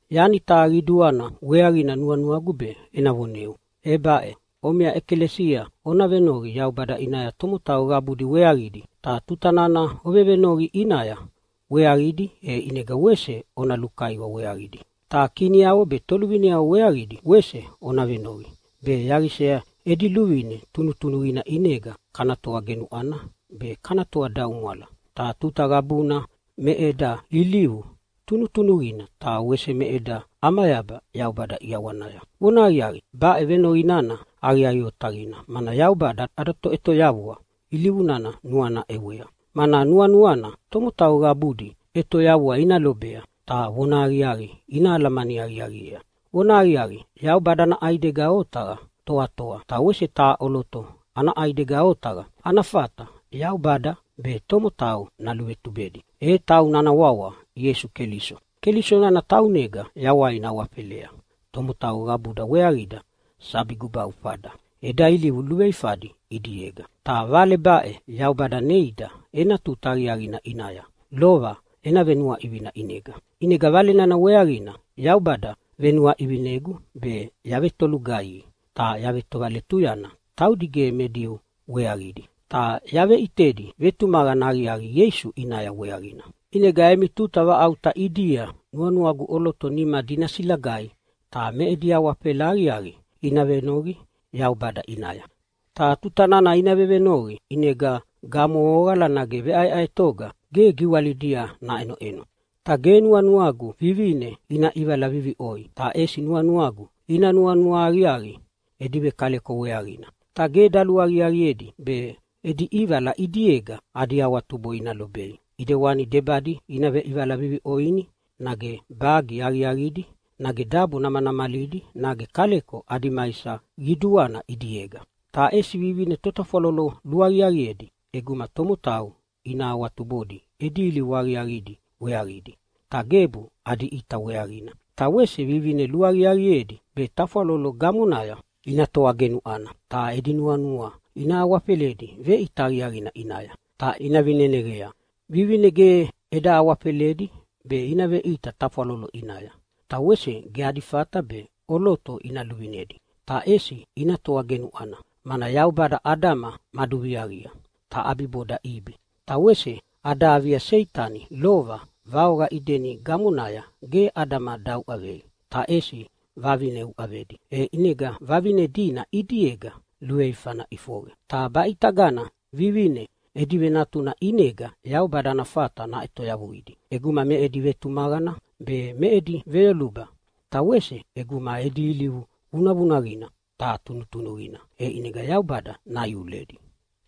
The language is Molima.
Yani taha qiduana weaqina nuanuagu be ena voneu, e baʼe: Omiʼa ʼekalesia ona venoqi Yaubada ʼinaya tomotau qabudi weaqidi. Ta tuta nana ovevenoqi ʼinaya weaqidi, e ʼinega wese ona lukaiwa weaqidi. Ta kiniavo be toluvineavo weaqidi wese ona venoqi, be yaqisa edi luvine tunutunuqina ʼinega kana toa genuʼwana be kana toadaumwala. Ta tuta qabuna me eda ilivu tunutunuqina, ta wese me eda ʼamayaba Yaubada ʼiawanaya. Vonahaqiaqi, baʼe venoqi nana aqiaqi otaqina, mana Yaubada ada Toʼetoyavua ilivu nana nuana ʼewea, mana nuanuana tomotau qabudi ʼetoyavua ina lobei ta vonahaqiaqi ina alamani aqiaqiea. Vonahaqiaqi, Yaubada ana ʼaidega otaqa toatoa, ta wese taha ʼoloto ana ʼaidega otaqa ana fata Yaubada be tomotau naluvetubedi, e tauna ana wawa Ieisu Keliso. Keliso nana taunega yawaina awafelea tomotau qabuda weaqida sabi gubaufada eda ilivu luveifadi ʼidiega. Ta Vale baʼe Yaubada neida ena tuta aqiaqina ʼinaya lova ena venuaʼivina ʼinega. ʼInega Vale nana weaqina Yaubada venuaʼivinegu be yavetolugaihi ta yavetovaletuyana taudi ge me Diu weaqidi, ta yaveʼitedi vetumaqana aqiaqi Ieisu ʼinaya weaqina. ʼInega emi tuta vaʼauta ʼidia nuanuagu ʼoloto nimadi ina silagaidi ta me edi awafela aqiaqi ina venoqi Yaubada ʼinaya. Ta tuta nana ina vevenoqi ʼinega gamohoqala nage veʼaeʼaetoga ge giwalidia naʼenoʼeno. Ta ge nuanuagu vivine ina ʼivala viviʼoi. Ta ʼesi nuanuagu ina nuanua aqiaqi edi vekaleko weaqina. Ta ge daluaqiaqiedi be edi ʼivala ʼidiega adi awatubo ina lobei, ʼidewani debadi ina veʼivala viviʼoini nage bagi aqiaqidi nage dabo namanamalidi nage kaleko adi maisa qiduana ʼidiega. Ta ʼesi vivine totafwalolo luaqiaqiedi ʼeguma tomotau ina awatubodi edi ilivu aqiaqidi weaqidi, ta gebu adi ʼita weaqina. Ta wese vivine luaqiaqiedi be tafwalolo gamonaya ina toa genuʼwana ta edi nuanua ina awafeledi veʼita aqiaqina ʼinaya ta ina vineneqea. Vivine ge eda awafeledi be ina veʼita tafwalolo ʼinaya. Ta wese ge adi fata be ʼoloto ina luvinedi, ta ʼesi ina toa genuʼwana, mana Yaubada Adama maduviaqia, ta ʼabiboda Ibi. Ta wese ada avia Seitani lova vaoqa Ideni gamonaya ge Adama dauʼavei, ta ʼesi vavine uʼavedi, e ʼinega vavine dina ʼidiega luveifana ʼifoqe. Ta baʼitagana vivine edi venatuna ʼinega Yaubada ana fata naʼetoyavuidi. ʼEguma me edi vetumaqana be, me edi veyoluba, ta wese ʼeguma edi ilivu vunavunaqina ta tunutunuqina, e ʼinega Yaubada naiuledi.